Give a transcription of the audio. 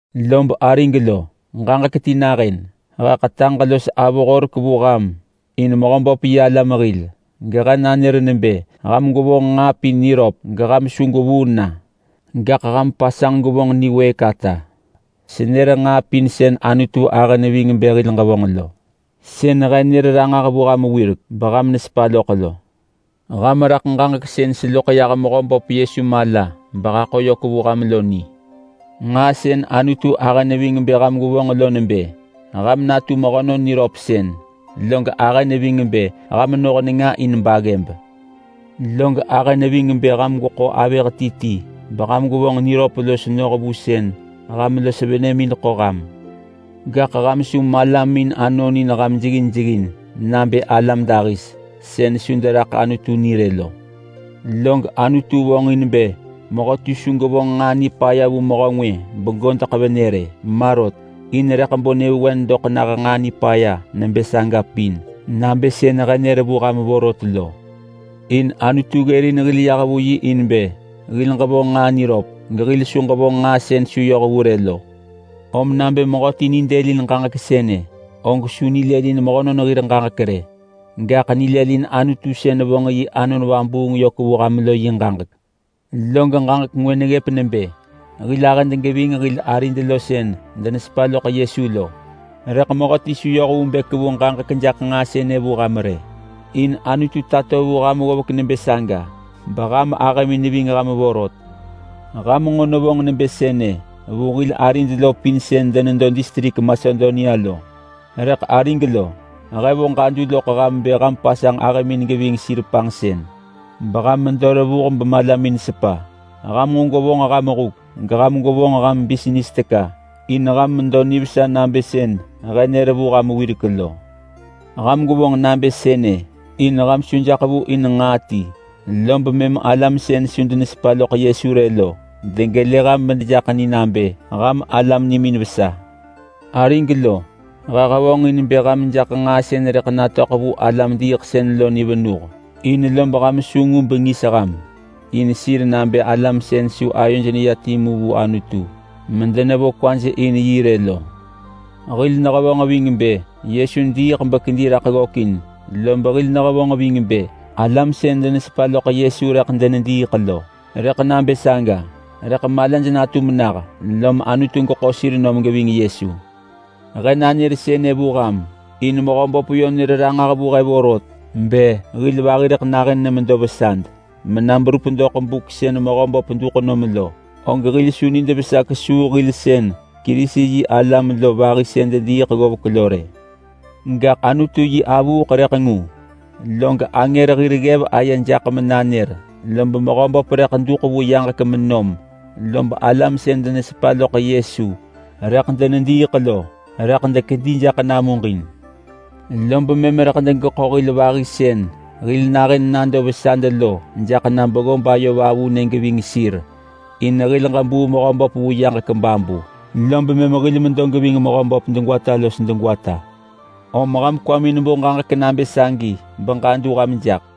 Lob arig lo, ġaġek ti nahën! He ḳetaġ los avo horek vu ham in Mehöböp yi alam hil, gehe nanër nebë ham gwevonġ nġaa pin niröp geham su gwevuu na, gaḳ ham pasanġ gwevonġ niwëëk ata. Senër nġaa pin sën Anutu ahë neving bë hil ġevonġ lo. Sën he nër ranġah vu ham wirek beham nesepa loḳ lo. Ham raḳ ġaġek sën seloḳ yah Mehöböp Yesu mala behaḳo yök vu ham lo ni. Nġaa sën Anutu ahë neving bë ham gwevonġ lo nebë: Ham natu mehönon niröpsën. Log ahë neving bë ham noh nenga in baggëb. Log ahë neving bë ham gweḳo avëh ti ti beham gwevonġ niröp los noh vu sën ham los venëmin ḳo ham. Gaḳ ham su malamin anonin ham jeggin jeggin nabë alam dahis sën su deraḳ Anutu ni rë lo. Log Anutu vonġin bë mehöti su gevonġ nġaa nipaya vu mehö ngwë begodeḳ venë rë, ma rot. In rëḳ bo nyëvewen doḳ nah nġaa nipaya nebë saga pin nabë sën he nër vu ham vorot lo. In Anutu ggërin hil yah vu yi in bë hil ġevonġ nġaa niröp gehil su ġevonġ nġaa sën su yoh vu rë lo. Om nabë mehöti nidëlin ġaġek sënë, og su nilëlin mehönon hir ġaġek rë, gaḳ nilëlin Anutu sën vonġ yi Anon Vabuung yök vu ham lo yi ġaġek. Log ġaġek ngwë neggëp nebë hil ahëd geving hil arid lo sën denesepa loḳ Yesu lo. Rëḳ mehöti su yoh vu bë kevu ġaġek jaḳ nġaa sënë vu ham rë, in Anutu tato vu ham ggovek nebë saga beham ahëmin neving ham vorot. Ham nġo nevonġ nebë sënë vu hil arid lo pin sën denedo distrik Masedonia lo. Rëḳ arig lo, he vo ġadu loḳ ham bë ham pasanġ ahëmin geving sir panġsën, beham medo revuh bemalamin sepa. Ham nġo gwevonġ ham huk, geham gwevonġ huk bisnis teka in ham medo nivesa nabë sën he nër vu ham wirek lo. Ham gwevonġ nabë sënë in ham su jaḳ vu in nġaa ti rë, lob mëm alam sën su denesepa loḳ Yesu rë lo degelë ham medejaḳ ni nabë ham alam nimin vesa. Arig lo, he hevonġin bë ham jaḳ nġaa sën rëḳ natöḳ vu alam-diiḳsën lo ni venuh in lob ham su ngu bengis ham in sir nabë alam sën su ayoj neya timu vu Anutu medenevo kwaj in yi rë lo. Hil nehevonġ ving bë Yesu diiḳ bekedi raḳ ggökin, lob hil nehevonġ ving bë alam sën denesepa loḳ Yesu rëḳ denediiḳ lo, rëḳ nabë saga. Rëḳ malaj natum nah, lom Anutu geḳo sir nom geving Yesu. He nanër sënë vu ham in Mehöböp yö nër ranġah vu he vorot. Bë hil vahi rëḳ nahën nemedo vesad mena berup doḳ buk sën Mehöböp duḳ nom lo, og hil su nid vesa kesuu hil sën Kerisi-yi-alam lo vahi sën dediiḳ ggovek lo rë. Gaḳ Anutu yi avuuḳ rëḳ ngu log angër hir ggev aye jaḳ menanër, lob Mehöböp rëḳ duḳ vu yaġek menom. Lob alam sën denesepa loḳ Yesu rëḳ denediiḳ lo, rëḳ dekedi jaḳ namuġin. Lob mëm rëḳ degeḳo hil vahi sën hil nahën nado vesad lo jaḳ na beggob ayo vavunë geving sir in hil ġebuu Mehöböp vu yaġek babu, lob mëm hil medo geving Mehöböp degwata los degwata. Om ham kwamin bo ġaġek nabë sagi beham ġadu ham jaḳ.